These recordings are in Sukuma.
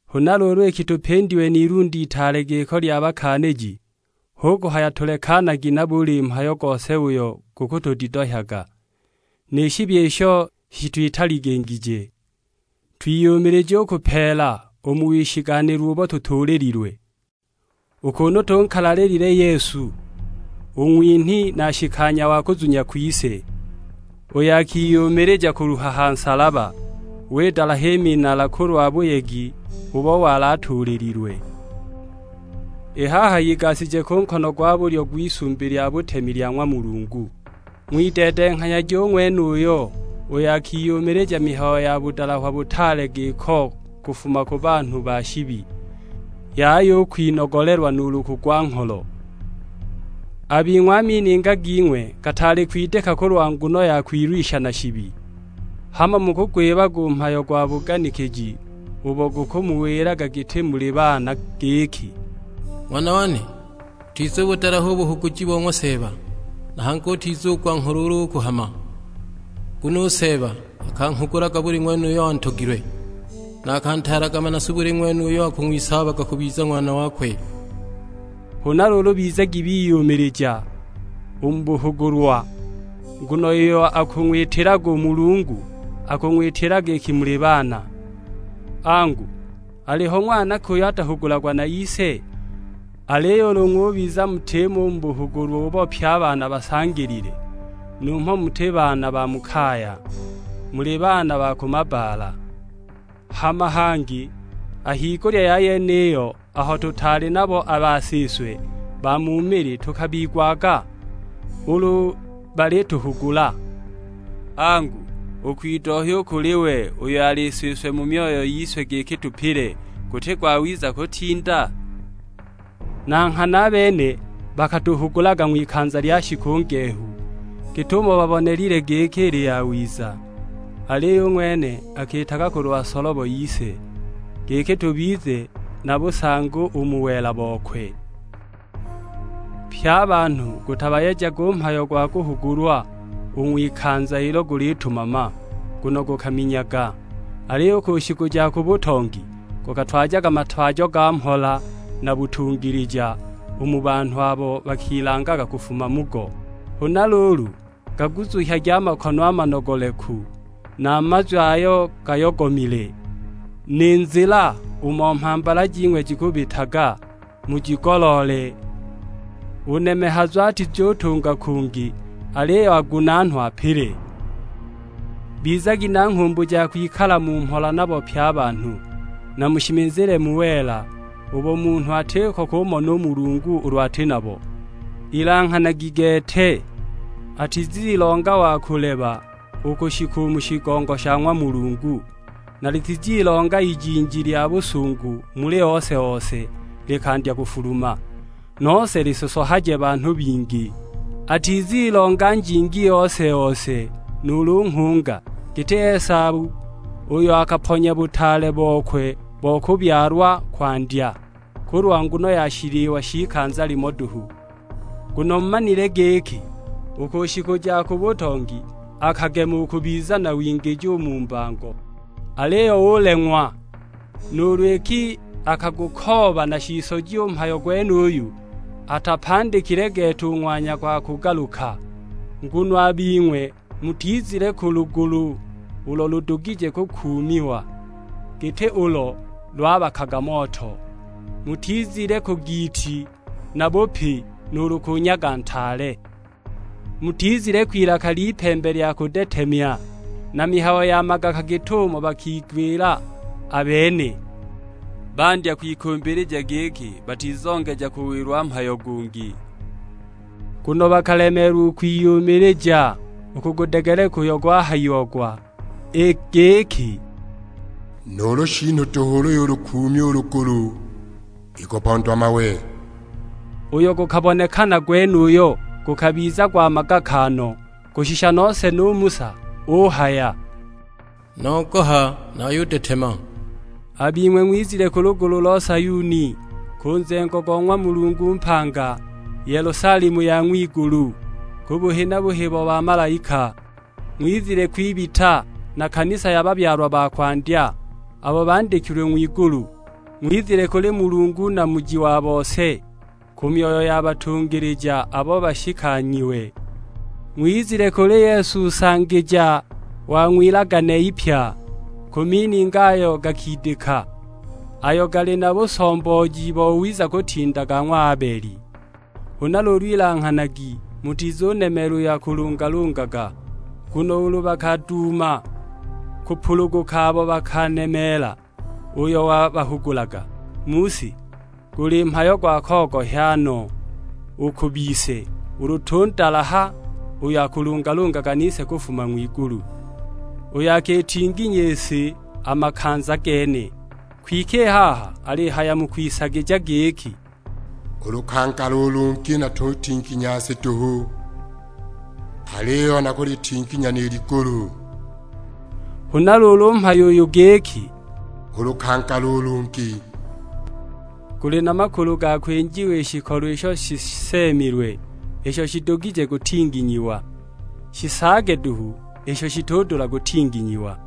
Huna luulu iki tupindiwe n'ilunde itaale giko lya bakaaniji, hu kuhaya tulekanagi na buli mhayo gose uyo gukutudidohyaga, ni shibi isho shitwitaligingije. Twiyumilije u kupeela u mu wishiganhilwa ubo tutuulililwe; u kunu tunkalalilile Yesu, u ng'winhi na nshikanya wa kuzunya kwise, uyo akiyumilija kuluha ha nsalaba, widalaha i minala kulwa buyegi ubo wali atuulililwe; i haha igashije ku nkono gwa bulyo gw'Isumbi lya butemi lya ng'wa Mulungu. Ng'wideedenghanyagi u ng'wenuyo, uyo akiyumilija mihayo ya budalahwa butaale giko kufuma ku banhu ba shibi, yaya u kwinogolelwa nuulu kugwa-ngholo. A bing'we a mininga ging'we gataali kwidika kulwa nguno ya kwilwisha na shibi. Hamo mukugwibaga u mhayo gwa buganikiji ubo bukumuwilaga giti muli baana; giki, "Ng'wana wane, utizubudalaha u buhuguji bo ng'wa Seeba, na hangi utizugwa ngholo ulu ukuhama. Nguno u Seeba akanghugulaga buli ng'wene uyo antogilwe; na akantaalaga manasu buli ng'wene uyo akang'wisaabaga kubiza ng'wana wakwe." Huna luulu bizagi biyumilija u mu buhugulwa, nguno iyo akung'witilaga u Mulungu akung'witilaga iki muli baana; angu, aliho ng'wana ki uyo atahugulagwa na ise? Aliyo ulu ng'ubiza mutimo u mu buhugulwa ubo pye a baana basangilile, numho muti baana ba mu kaya, muli baana ba ku mabbaala! Hama hangi a higulya ya yeniyo, aho tutaali nabo a basiswe ba mu mili tukabigwaga ulu balituhugula; angu, u kwidohya u kuli we uyo ali Siswe mu myoyo yise giki tupile, guti gwawiza kutinda? Na nghana a bene bakatuhugulaga ng'wikanza lya shiku ngehu git'umo babonelile giki ili yawiza, aliyo u ng'wene akiitaga kulwa solobo yise, giki tubize na busangi u mu wela bokwe. Pye a banhu gutabayejaga u mhayo gwa kuhugulwa u ng'wikanza ilo gulitumama, nguno gukaminyaga; aliyo u ku shiku ja ku butongi gukatwajaga matwajo ga mhola na butungilija, u mu banhu abo bakilangaga kufuma mugo. Huna luulu, gaguzuhyagi a makono a manogoleku, na a mazwi ayo gayogomile. Ni nzila umo mhambala jing'we jikubitaga mujigoloole, u nemehazu atizutunga kungi, aliyo agunaanwe apile. Bizagi na nghumbu ja kwikala mu mhola nabo pye a banhu; na mushimizile mu wela, ubo munhu atiko kumona u Mulungu ulu ati nabo. Ilanghanagi gete, atizilonga wa kuleba u kushika u mu shigongo sha ng'wa Mulungu, na litizilonga ijinji lya busungu muli ose-ose, likandya kufuluma; nose lisosohaje banhu bingi. Atizilonga njingi ose-ose nuulu nghunga, giti Esau, uyo akaponya butaale bokwe bo kubyalwa kwandya, kulwa nguno ya shiliwa sh'ikanza limo duhu. Nguno mumanile giki, u ku shiku ja ku butongi akagema u kubiza na wingiji u mu mbango, aliyo uleng'wa nuulu iki akagukooba na shisoji u mhayo gwenuyo; atapandikile gete u ng'wanya gwa kugaluka! Nguno a bing'we mutizile ku lugulu ulo ludugije kukuumiwa, giti ulo lwabakaga moto, mutizile ku giiti na bupi, nuulu ku nyaga ntaale. Mutizile kwilaka ly'ipembe lya kudetemya, na mihayo ya magaka git'umo bakigwila a bene, bandya kwikumbilija giki batizongeja kuwilwa mhayo gungi! Nguno bakalemeelwa u kwiyumilija u kugudegeleka uyo gwahayiagwa; i giki, "Nuulu shiinu duhu ulu yulukuumya u lugulu ikupondwa mawe!" Uyo gukabonekana gwenuyo gukabiza gwa magaka no, kushisha nose nu Musa uhaya, "Nogoha, nayudetema!" A bing'we ng'wizile ku lugulu lo Sayuni, ku nzengo go ng'wa Mulungu mpanga, Yelusalemu ya ng'wigulu; ku buhi na buhi bo bamalaika. Ng'wizile kwibita, na kanisa ya babyalwa ba kwandya, abo bandikilwe ng'wigulu; ng'wizile kuli Mulungu Namuji wa bose, ku myoyo ya batungilija abo bashikanyiwe. Ng'wizile kuli Yesu Nsangija wa Ng'wilagane ipya; ku mininga ayo gakidika, ayo gali na busombooji bowiza kutinda ga ng'wa Abeli. Huna luulu ilanghanagi mutizunemeela uyo akulungalungaga; nguno ulu bakaduuma kupuluguka abo bakaanemeela uyo wabahugulaga mu si, guli mhayo gwa kogohya no u ku bise ulu tundalaha uyo akulungalungaga nise kufuma ng'wigulu; uyo akitinginya i si a makanza gene. Kwike i haha alihaya mu kwisagija giki, "U lukangala u lungi natutinginya si duhu, aliyo nakulitinginya ni ligulu!" Huna luulu u mhayo uyu giki, "U lukangala u lungi," guli na makulu ga kwinjiwa i shikolo isho shiseemilwe, isho shidugije kutinginyiwa; shisaage duhu isho shitudula kutinginyiwa.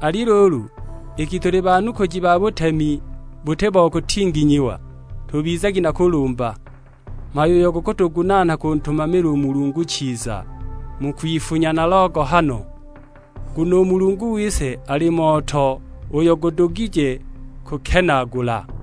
Ali luulu iki tuli banukuji ba butemi buti bo kutinginyiwa, tubizagi na kulumba; mhayo uyo gukutugunaana kuntumamila u Mulungu chiza, mu kwifunya na logohano. Nguno u Mulungu wise ali moto uyo gudugije kukenaagula!